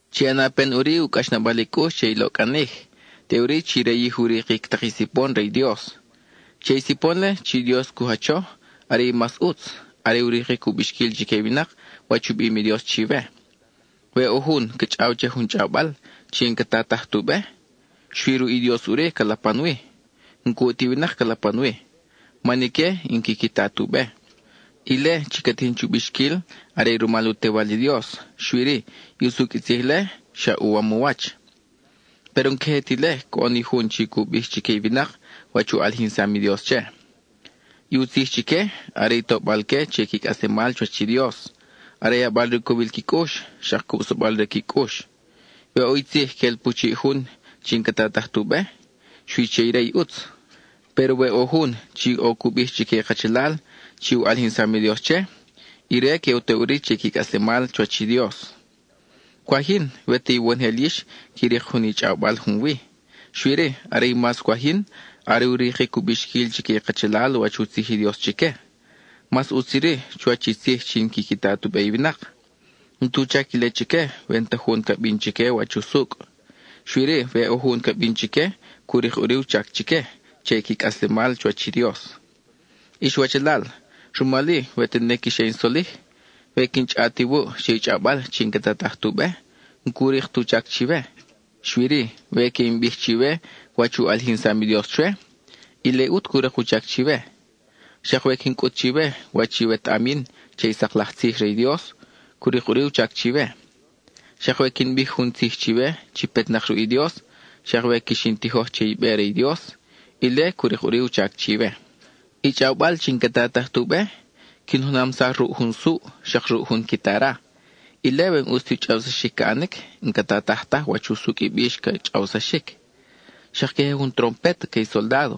Chi ʼana pen ʼuri u cʼaxnabal i cʼux che i loʼcʼanij, teʼuri chi rayij u rikic tak i sipon re i Dios. Che i sipon-le chi Dios cu jacho, are i mas ʼutz, are u rikic u bixquil chique i winak wach u bim i Dios chiwe. We ʼo jun ca chʼaw che jun chʼawbal chi n-ca tataj tu be, xui ruʼ i Dios ʼuri ca lapan wi; n-cuʼ ti winak ca lapan wi, man ique n-quiqui ta tu be. Ile chi ca tijin chu bixquil are rumal u Tewal i Dios, xui-ri, i usucʼ i tzij-le xa uwam u wach. Péro n-queje ti ile coʼon i jun chi cu bij chique i winak wach u ʼalijinsam i Dios che. I u tzij chique, are tobal-que che qui cʼaslemal chuwach i Dios, are yabal re u cowil qui cʼux, xak cubsabal re qui cʼux. We ʼo i tzij quel pu chiʼ jun chi n-ca tataj tu be, xui che ire i ʼutz; péro we ʼo jun chi ʼo cu bij chique i kachalal chi u ʼalijinsam i Dios che, ire que u to ʼuri che i qui cʼaslemal chuwach i Dios. Cwaj yin, we ta iwonojel yix qui rik jun i chʼawbal junwi, xui-ri, are mas cwaj yin, are u rikic u bixquil chique i kachalal wach u tzij i Dios chique. Mas ʼutz iri chuwach i tzij chi n-quiqui ta tu be i winak. N-tu chac ile chique we n-ta jun ca bin chique wach usucʼ. Xui-ri, we ʼo jun ca bin chique, cu rik ʼuri u chac chique che i qui cʼaslemal chuwach i Dios. Ix wachalal, rumal-i, we tene quix ʼe in solij, we quin chʼaʼat iwuʼ che i chʼawbal chi n-ca tataj tu be, n-cu rik tu chac chiwe. Xui-ri, we que in bij chiwe wach u ʼalijinsam i Dios chwe, ile ʼut cu rik u chac chiwe. Xak we quin cʼut chiwe wach i wetaʼam yin che i sak laj tzij re i Dios, cu rik ʼuri u chac chiwe. Xak we quin bij jun tzij chiwe chi petnak ruʼ i Dios, xak we quix in tijoj che i be re i Dios, ile cu rik ʼuri u chac chiwe. I chʼawbal chi n-ca tataj tu be, quin junamsaj ruʼ jun suʼ, xak ruʼ jun quitara; ile we n-ʼus ti u chʼawsaxic ca ʼanic, n-ca tataj taj wach usucʼ i bix ca chʼawsaxic. Xak queje jun trompet que i soldádo,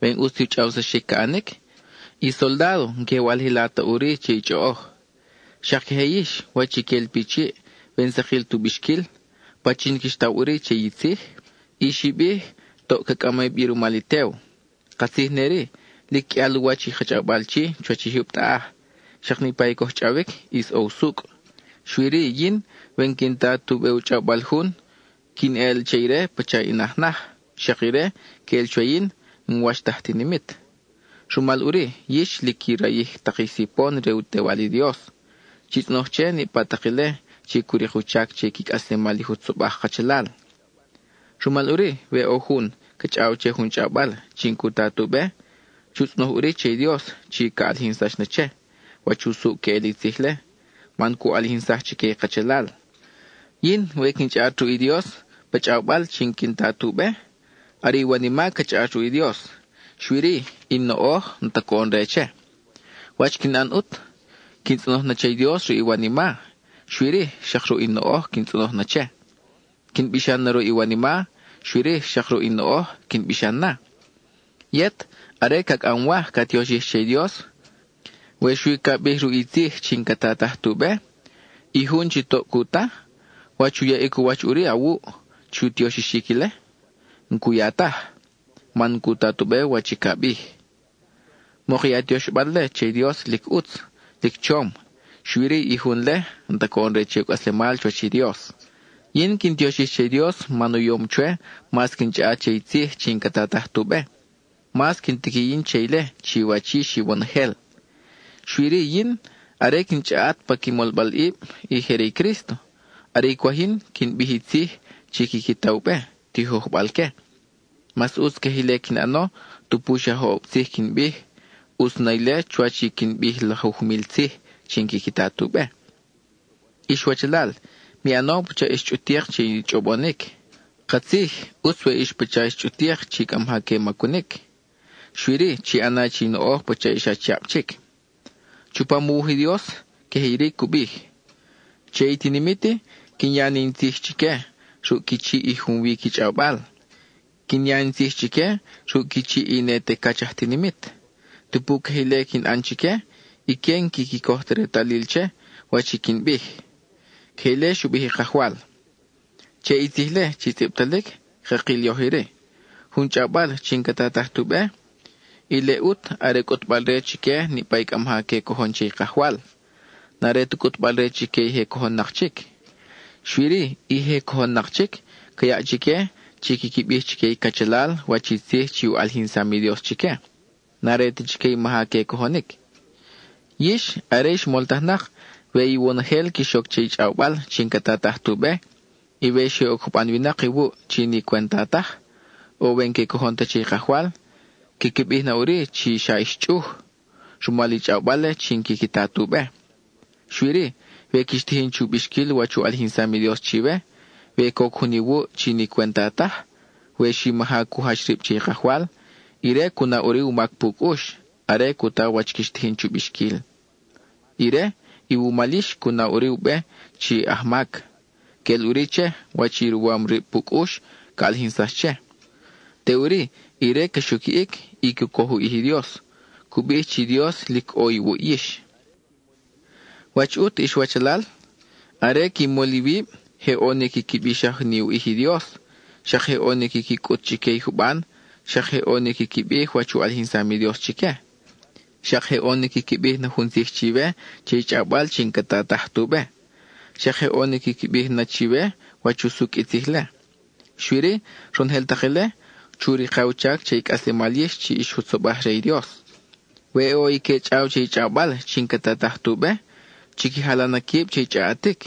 we n-ʼus ti u chʼawsaxic ca ʼanic, i soldádo n-que walij la ta ʼuri che i chʼoʼoj. Xak queje yix, wach i quel pi chiʼ, we n-sakil tu bixquil, ¿pachin quix taw ʼuri che i tzij? I xi bij, toʼ ca cʼami bi rumal i tew. Katzij ne-ri, lic qʼuial u wach i ka chʼawbal chi, chuwach i jyub taʼaj; xak niʼpa i coj chʼawic ʼis ʼo usucʼ. Xui-ri yin, we n-quin ta tu be u chʼawbal jun, quin eʼel che ire pacha in aj naj, xak ire, queʼel chwe yin, n-wach ta aj tinimit. Rumal ʼuri, yix chi lic qui rayij tak i sipon re u Tewal i Dios, chi tzʼonoj che niʼpa tak ile chi cu rik u chac che i qui cʼaslemal i jutzobaj kachalal. Rumal ʼuri, we ʼo jun ca chʼaw che jun chʼawbal chi n-cu ta tu be, chu tzʼonoj ʼuri che i Dios chi ca ʼalijinsax na che, wach usucʼ queʼel i tzij-le, man cu ʼalijinsaj chique i kachalal. Yin, we quin chʼaʼat ruʼ i Dios pa chʼawbal chi n-quin ta tu be, are i wanima ca chʼaʼat ruʼ i Dios, xui-ri, i in noʼoj n-ta coʼon re che. ¿Wach quin ʼan ʼut? Quin tzʼonoj na che i Dios ruʼ i wanima, xui-ri, xak ruʼ in noʼoj quin tzʼonoj na che. Quin bixan na ruʼ i wanima, xui-ri, xak ruʼ in noʼoj quin bixan na. Yet, are ca cʼamwaj ca tioxij che i Dios, we xui ca bij ruʼ i tzij chi n-ca tataj tu be, i jun chi toʼ cu ta, ¿wach u yaʼic u wach ʼuri awuʼ chu tioxixic ile? N-cu ya taj, man n-cu ta tu be wach i ca bij. Mok i a tioxbal-le che i Dios lic ʼutz, lic chom, xui-ri i jun-le, n-ta coʼon re che u cʼaslemal chuwach i Dios. Yin quin tioxij che i Dios man u yom chwe mas quin chʼaʼat che i tzij chi n-ca tataj tu be, mas quin tiqui yin che ile chiwach yix iwonojel. Xui-ri yin, are quin chʼaʼat pa qui molbalʼib i je re i Crísto, are i cwaj yin, quin bij i tzij chi quiqui ta u be, tijojbal-que. Mas ʼutz queje ile quin ʼano, tupu xa joʼob tzij quin bij; ʼutz na ile chuwach i quin bij lajuj mil tzij chi n-quiqui ta tu be. Ix wachalal, mi ʼano pacha ix chʼutik che i chʼobonic. Katzij, ʼutz we ix pacha ix chʼutik chi cʼa maja que macunic, xui-ri chi ʼana che i noʼoj pacha ix achiab chic. Chupam u wuj i Dios, queje iri cu bij: Che i tinimit-i, quin ya ni in tzij chique ruʼ qui chiʼ i junwi qui chʼawbal. Quin ya in tzij chique ruʼ qui chiʼ i ne te cach aj tinimit. Tupu queje ile quin ʼan chique, ique n-quiqui coj ti retalil che wach i quin bij. (Queje ile xu bij i Kajwal.) Che i tzij-le chi tzʼibtalic, cakil yoj iri: jun chʼawbal chi n-ca tataj tu be, ile ʼut are cʼutbal-re chique niʼpa cʼa maja que cojon che i Kajwal; n-are ta cʼutbal-re chique i je cojon-nak chic. Xui-ri, i je cojon-nak chic, ca yaʼ chique chi quiqui bij chique i cachalal wach i tzij chi u ʼalijinsam i Dios chique; n-are ta chique i maja que cojonic. Yix, are ix moltajnak, we iwonojel quix oc che i chʼawbal chi n-ca tataj tu be, y we xe oc juban winak iwuʼ chi ni cwenta taj, o we n-que cojon ta che i Kajwal, quiqui bij na ʼuri chi xa ix chʼuj, (rumal i chʼawbal-le chi n-quiqui ta tu be). Xui-ri, we quix tijin chu bixquil wach u ʼalijinsam i Dios chiwe, we coc jun iwuʼ chi ni cwenta taj, we xi maja cu jach rib che i Kajwal, ire cu na ʼuri u mac pu cʼux, are cu ta wach quix tijin chu bixquil. Ire, iwumal yix, cu na ʼuri u be chi aj mac. Queʼel ʼuri che, wach i ruwam rib pu cʼux ca ʼalijinsax che. Teʼuri, ire ca xuquiʼic, y cu coj u ʼij i Dios; cu bij chi i Dios lic ʼo iwuʼ yix. ¿Wach ʼut, ix wachalal? Are qui mol iwib, je ʼo ni quiqui bixaj ni u ʼij i Dios, xak je ʼo ni quiqui cʼut chique i juban; xak je ʼo ni quiqui bij wach u ʼalijinsam i Dios chique. Xak je ʼo ni quiqui bij na jun tzij chiwe che i chʼawbal chi n-ca tataj tu be; xak je ʼo ni quiqui bij na chiwe wach usucʼ i tzij-le. Xui-ri, ronojel tak ile, chu rika u chac che i cʼaslemal yix chi ix jutzobaj re i Dios. We ʼo i que chʼaw che i chʼawbal chi n-ca tataj tu be, chiqui jala na quib che i chʼaʼatic;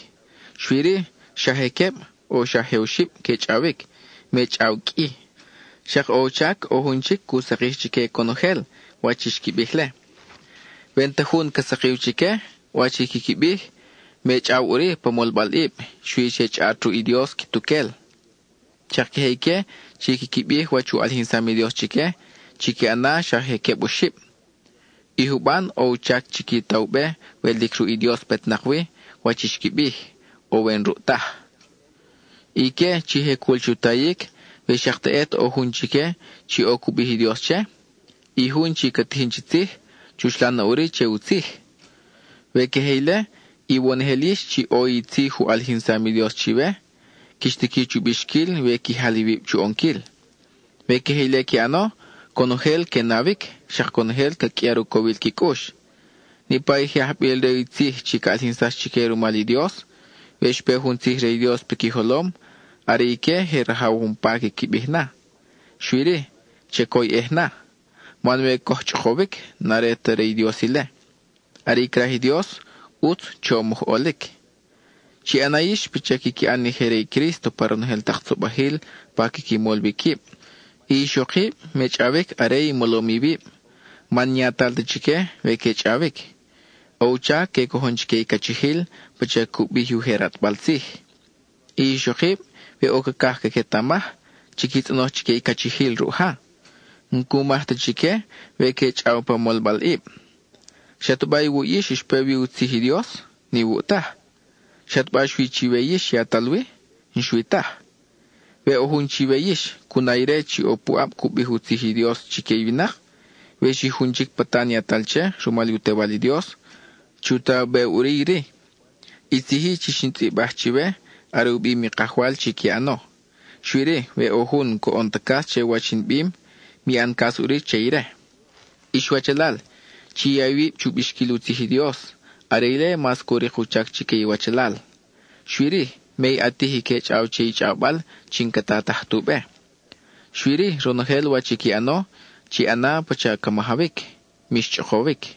xui-ri xa je queb, o xa je oxib que chʼawic, me chʼaw qʼui. Xak ʼo u chac ʼo jun chic cu sakij chique conojel wach i xqui bij-le. We n-ta jun ca sakiw chique wach i quiqui bij, me chʼaw ʼuri pa molbalʼib; xui che chʼaʼat ruʼ i Dios quituquel. Xak queje ique chi quiqui bij wach u ʼalijinsam i Dios chique, chiqui ʼana xa je queb oxib; i juban ʼo u chac chiqui ta u be we lic ruʼ i Dios petnak wi wach i xqui bij, o we n-ruʼ taj. Ique chi je cul chu tayic, we xak teʼet ʼo jun chique chi ʼo i cu bij i Dios che, i jun chi ca tijin chi tzij, chuxlan na ʼuri che u tzij. We queje ile, iwonojel yix chi ʼo i tzij u ʼalijinsam i Dios chiwe, quix tiqui chu bixquil we qui jal iwib chu ʼonquil. We queje ile qui ʼano, conojel que nawic, xak conojel ca qʼuiar u cowil qui cʼux. Niʼpa i je ajbil re i tzij chi ca ʼalijinsax chique rumal i Dios, we xpe jun tzij re i Dios piqui jolom, are ique je rajaw umpa quiqui bij na, xui-ri chacoyʼej na. Man we coj chʼokowic, n-are ta re i Dios ile; are i craj i Dios, ʼutz chom oj ʼolic. Chi ʼana yix pacha quiqui ʼan i je re i Crísto pa ronojel tak tzobajil pa quiqui mol wi quib; i ixokib me chʼawic are i molom iwib, man n-yatal ta chique we que chʼawic. ʼO u chac que cojon chique i cachijil pacha cu bij i ujer ʼatbal tzij. I ixokib, we ʼo cacaj caquetamaj, chique tzʼonoj chique i cachijil ruʼ ja; n-cu maj ta chique we que chʼaw pa molbalʼib. ¿Xataba iwuʼ yix xpe wi i u tzij i Dios? N-iwuʼ taj. ¿Xataba xui chiwe yix yatal wi? N-xui taj. We ʼo jun chiwe yix, cu na ire chi ʼo puʼab cu bij u tzij i Dios chique i winak, we xi jun chic patan yatal che rumal u Tewal i Dios, chu ta u be ʼuri iri: i tzij-i chi xin tzʼibaj chiwe, are u bim i Kajwal chi qui ʼano. Xui-ri, we ʼo jun n-coʼon ta cas che wach in bim, mi ʼan cas ʼuri che ire. Ix wachalal, chi ya iwib chu bixquil u tzij i Dios (are ile mas cu rik u chac chique iwachalal); xui-ri, me i ʼatij i que chʼaw che i chʼawbal chi n-ca tataj tu be. Xui-ri, ronojel wach i qui ʼano, chi ʼana pacha ca majawic; mix chʼokowic.